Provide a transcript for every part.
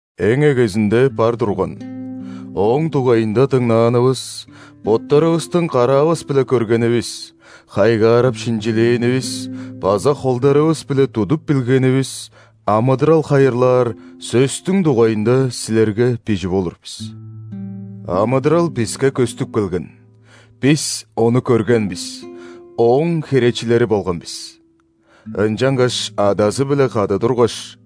Эң эгезинде бар турган, Ооң дугайында дыңнаанывыс, боттарывыстың караавыс-биле көргенивис, хайгаарап шинчилээнивис база холдарывыс-биле тудуп билгенивис амыдырал хайырлаар Сөстүң дугайында силерге бижип олур бис. Амыдырал биске көстүп келген, бис Ону көрген бис, Ооң херечилери болган бис. Ынчангаш Адазы-биле кады тургаш,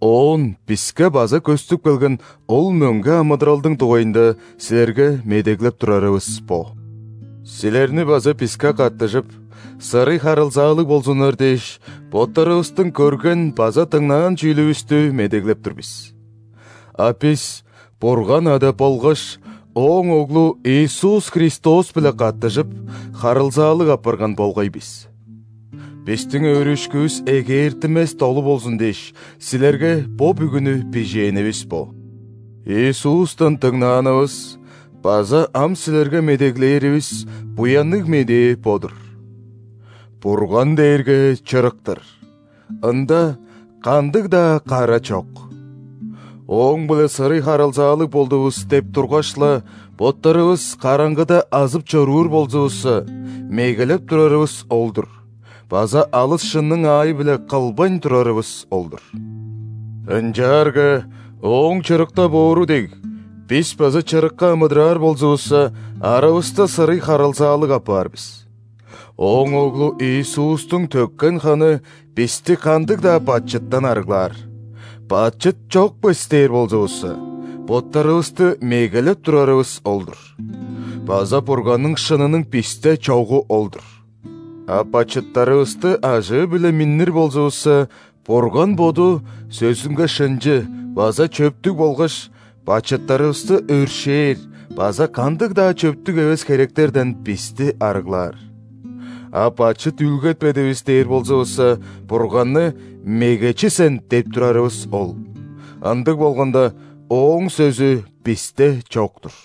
оон биске база көстүп келген ол мөңге амыдыралдың дугайында силерге медеглеп турарывыс бо. Силерни база биске каттыжып, сырый харылзаалыг болзуннар дээш, боттарывыстың көрген база дыңнаан чүүлүвүстү медеглеп тур бис. А бис Бурган Ада болгаш Ооң Оглу Иисус Христос-биле каттыжып, харылзаалыг апарган болгай бис. Бистиң өөрүшкүвүс эгээртинмес долу болзун дээш, силерге бо бүгүнү бижээнивис бо. Иисустан дыңнаанывыс база ам силерге медеглээривис Буянныг Медээ бо-дур: «Бурган дээрге чырык-тыр, Ында кандыг-даа кара чок». «Ооң-биле сырый харылзаалыг болдувус» деп тургаш-ла, боттарывыс караңгыда азып чоруур болзувусса, мегелеп турарывыс ол-дур база алыс шынның аайы-биле кылбайн турарывыс ол-дур. Ынчаарга Ооң чырыкта боору дег, бис база чырыкка амыдыраар болзувусса, аравыста сырый харылзаалыг апаар бис, Ооң Оглу Иисустуң төккен ханы бисти кандыг-даа бачыттан арыглаар. «Бачыт чок бис» дээр болзувусса, боттарывысты мегелеп турарывыс ол-дур база Бурганның шынының бисте чогу ол-дур. А бачыттарывысты ажыы-биле миннир болзувусса, Бурган Боду сөзүнге шынчы база чөптүг болгаш, бачыттарывысты өршээр база кандыг-даа чөптүг эвес херектерден бисти арыглаар. А «Бачыт үүлгетпедивис» дээр болзувусса, Бурганны «Мегечи сен» деп турарывыс ол, ындыг болганда, Ооң сөзү бисте чок-тур.